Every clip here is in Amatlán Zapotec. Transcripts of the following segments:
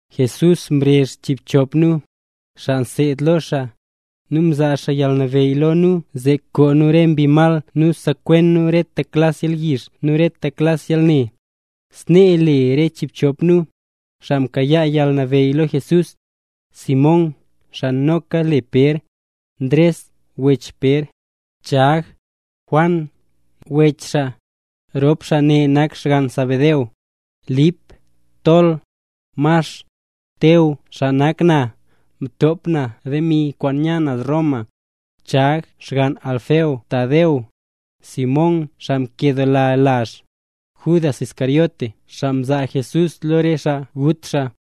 Jesús mrezh chiibchop nu, xaa mseed lo xaa, nu mzaa xaa yalnabeyy lo nu zee koo nu re mbi mal nu sekwen nu rete klas yalyizh nu rete klas yalne. Snee le re chiibchop nu, xaa mkayaa yalnabeyy lo Jesús: Simón (xaa noka le Pér), Ndres (wech Pér), Chag, Juan (wech xaa, rop xaa ne nak xgann Zebedeo), Lip, Tol, Max, Teo (xaa nak na, mtop na demi kwaan nya naz Roma), Chag (xgann Alfeo), Tadeo, Simón (xaa nkedoola lazh), Judas Iscariote (xaa mzaa Jesús lo re xaa gut xaa).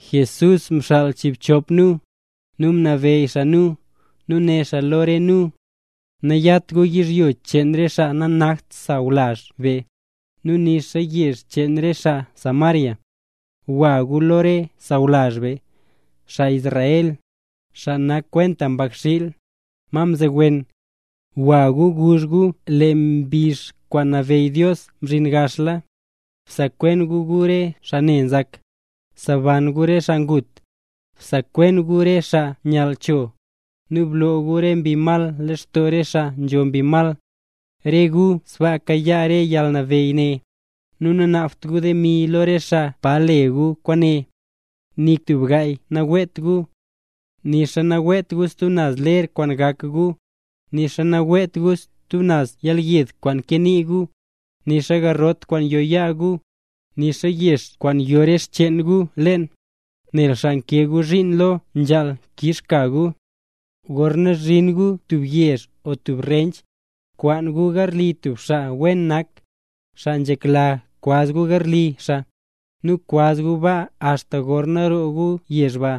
Jesús mxaal chiibchop nu, nu mnabeyy xaa nu, nu né xaa lo re nu: —Nayat gu yizhyo cheen re xaa nanakt xaa sawlazh be, nixa re yezh cheen xaa Samaria. Gwa gu lo re sawlazh be, xaa Israel, xaa nak kwenta mbakxiil, ma mzowen. Gwa gu guzh gu lee mbizh kwaan nabeyy Dios mzhin gaxla. Bsekwen gu re xaa ne nzak, seban gu re xaa ngut, bsekwen gu re xaa nyall cho, nu bloo gu re mbi mal lextoo re xaa nzho mbi mal. Re gu sbaasa mkayaa re yalnabeyy ne, nu nanaabt gu demi lo re xaa pa le gu kwaane. ’Nik tub gaay naweet gu. Nixa naweet gu stub naz ler kwaan gak gu, nixa naweet gu stub naz yelyed kwaan kee nii gu, nixa garrot kwaan yo yaa gu, nixa yex kwaan yo re xcheen gu leen, nel xaa nkee gu zhiin lo, nzhaal kix ka gu. ’Gorna zhin gu tub yezh o tub rench, kwaan gu garli tub xaa wen nak, xaa nzhekla kwaz gu garli xaa, nu kwaz gu baa axta gorna roo gu yezh ba.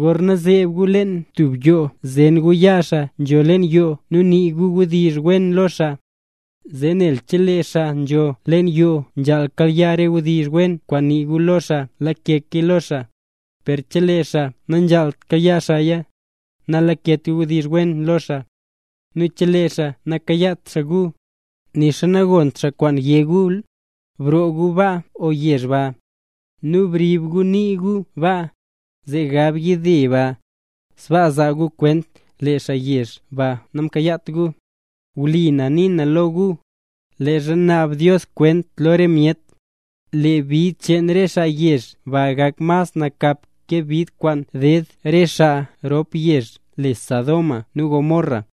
Gorna zeeb gu leen tub yoo zen gu yaa xaa nzho leen yoo nu nii gu wdizh wen lo xaa. Zee nel chelee xaa nzho leen yoo nzhaal kayaa re wdizh wen kwaan nii gu lo xaa lakeya lo xaa, per chelee xaa nanzhaalt kayaa xaaya, nalaket wdizh wen lo xaa. Nu chelee xaa nakayaat xaa gu, nixa nagont xaa kwaan yé gu, broo gu yoo ba o yezh ba. Nu brib gu nii gu baa, zee gab yide ba, sbaa zaa gu kwent lee xaa yezh ba namkayaat gu. Wlipa na nii na lo gu, leezha naab Dios kwent lo re myet, lee bid cheen re xaa yezh ba gak mas nakap ke bid kwaan ded re xaa rop yezh le Sodoma nu Gomorra.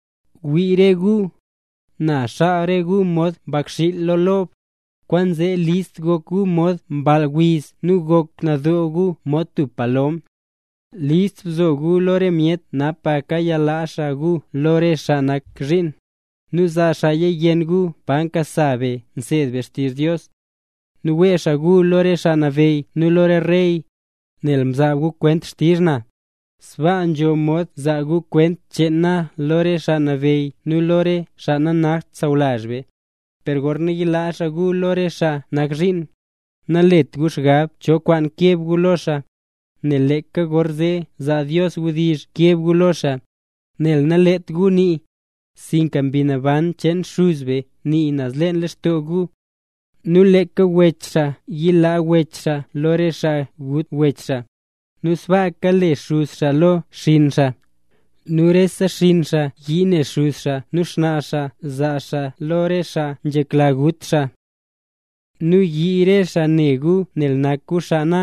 ’¡Wii re gu! Na xaal re gu mod mbakxiil lo re lob, kwaanzee list gok gu mod mball wiz nu gok nadoo gu mod tub palom. List bzo gu lo re myet napaka yalaa xaa gu lo re xaa nak zhiin, nu zaa xaaya yenn gu pa nkasa be nseed be xtizh Dios. Nu wee xaa gu lo re xaa nabeyy nu lo re rey, nel nzaa gu kwent xtizh na, sbaa nzho mod zaa gu kwent cheen na lo re xaa nabeyy nu lo re xaa nanakt sawlazh be. Per gorna yilaa xaa gu lo xaa nak zhiin, nalet gu xgab cho kwaan keb gu lo xaa, nel leeka gorzee zaa Dios wdizh keb gu lo xaa, nel nalet gu nii, sinka Mbi Naban cheen Xuz be nii naz leen lextoo gu. ’Nu leeka wech xaa yilaa wech xaa lo re xaa gut wech xaa, nu sbaaka le xuz xaa lo xinn xaa. Nu re xinn xaa yii ne xuz xaa nu xnaa xaa, nu zaa xaa xaa lo re xaa nzhekla gut xaa. Nu yii re xaa ne gu nel nak gu xaa na.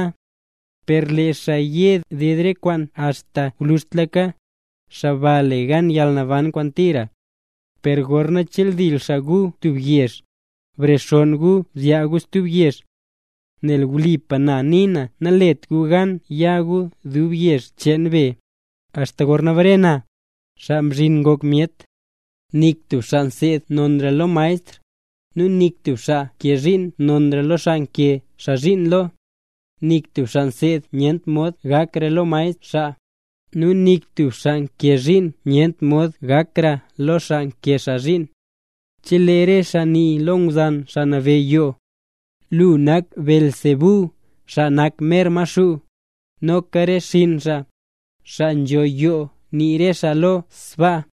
Per lee xaa ye ded re kwaane axta gwluzhtlaka, xaa ba le gan yalnaban kwaan tira. Per gorna cheldil xaa gu tub yezh, brexonn gu nu zyaa gu stub yezh. Nel wlipa na nii, nanalet gu gan ya gu dub yezh cheen be, axta gorna bare na, Xaa Mzhin Ngok Myet. ’Nik tub xaa nseed nonra lo xmaestr, nu nik tub xaa nkee zhiin nonra lo xaa nkee xaa zhiin lo. Nik tub xaa nseed nyent mod gakra lo xmaestr xaa, nu nik tub xaa nkee zhiin nyent mod gakra lo xaa nkee xaa zhiin. Chelee nii re xaa lo ngwzan xaa nabeyy yoo: “Lu nak Beelzebú, xaa nak mer Maxuu”, noka re xinn xaa, xaa nzho yoo nii re xaa lo sbaa.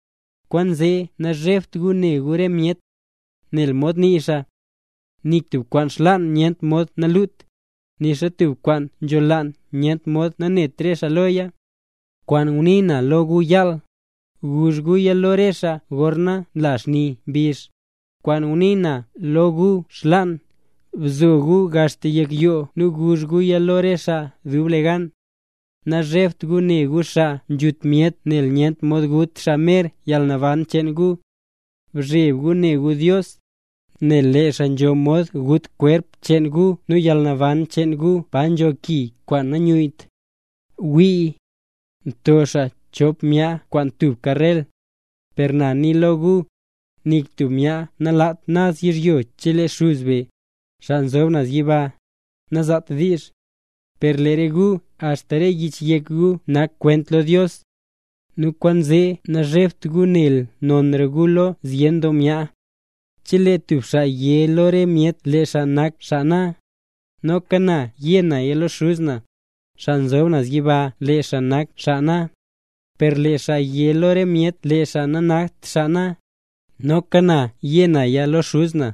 ’Kwaanzee nazhebt gu ne gu re myet. Nel mod nii xaa: “Nik tub kwaan xlaan nyent mod nalut, nixa tub kwaan nzholaan nyent mod nanet re xaa loya”. Kwaan ngunii na lo gu yaal, guzh guya lo re xaa gorna nla xni mbizh; kwaan ngunii na lo gu xlaan, bzo gu axta yek yoo nu guzh guya lo re xaa dublegan. Nazhebt gu ne gu xaa nzhut myet nel nyent mod gut xaa mer yalnaban cheen gu. Bzheb gu ne gu Dios, nel lee xaa nzho mod gut kwerp cheen gu nu yalnaban cheen gu pa nzho ki kwaan nanyuyyt. ’Wii, nto xaa chop myaa kwaan tubka rel. Per na nii lo gu, nik tub myaa nalat naz yizhyo chelee Xuz be, xaa nzob naz yiba, nazaat diizh. Per lee re gu axta re yich yek gu nak kwent lo Dios. Nu kwaanzee nazhebt gu nel nonra gu lo zyen doo myaa. ’Chelee tub xaa yé lo re myet lee xaa nak xaa na, noka na yé naya lo Xuz na, xaa nzob naz yiba lee xaa nak xaa na. Per lee xaa yé lo re myet lee xaa nanakt xaa na, noka na yé naya lo Xuz na,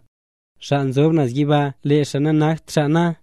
xaa nzob naz yiba lee xaa nanakt xaa na.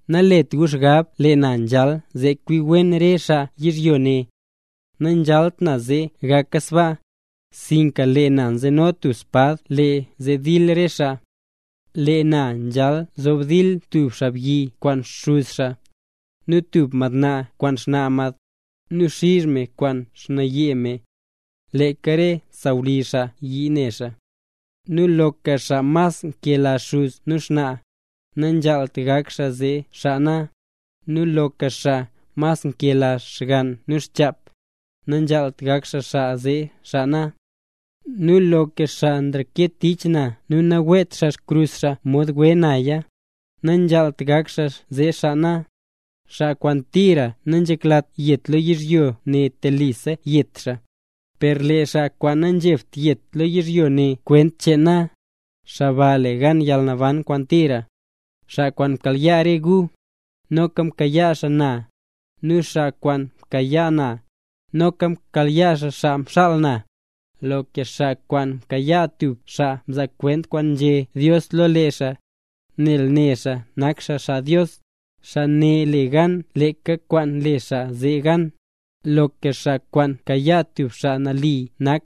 ’Nalet gu xgab lee na nzhal zee kwi wen re xaa yizhyo ne. Nanzhalt na zee gaka sbaa, sinka lee na nzeno tub spad kwaan le zee dil re xaa. Lee na nzhal zob dil tub xaabyi kwaan xuz xaa, nu tub madnaa kwaan xnaa mad, nu xiz me kwaan xnaaye me. Leeka re sawlizh xaa yii ne xaa. ’Nu loka xaa mas nkela xuz nu xnaa, nanzhaalt gak xaa zee xaa na, nu loka xaa mas nkela xgann nu xchap, nanzhaalt gak xaa zee xaa na. Nu loka xaa nanreket tich na nu naweet xaa xkrus xaa mod we naya, nanzhaalt gak xaa zee xaa na. Xaa kwaan tira nanzheklat yet lo yizhyo ne telisa yet xaa, per lee xaa kwaan nanzhebt yet lo yizhyo ne kwent cheen na, xaa ba le gan yalnaban kwaan tira. ’Xaa kwaan nkayaa re gu, noka nkayaa xaa na. Nu xaa kwaan nkayaa na, noka nkayaa xaa xaa mxaal na. Loka xaa kwaan nkayaa tub xaa nzaa kwent kwaan nzhé Dios lo lee xaa, nel ne xaa nak xaa xaa Dios, xaa ne le gan leeka kwaan le xaa zee gan. Loka xaa kwaan nkayaa tub xaa nali nak,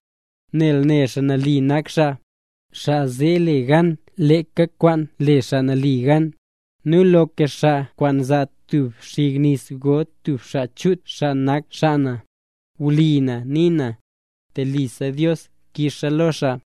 nel ne xaa nali nak xaa, xaa zee le gan leeka kwaan le xaa nali gan. Nu loka xaa kwaan zaa tub xig nis go tub xaa chut xaa nak xaa na, wlipa na nii na, telisa Dios kixa lo xaa.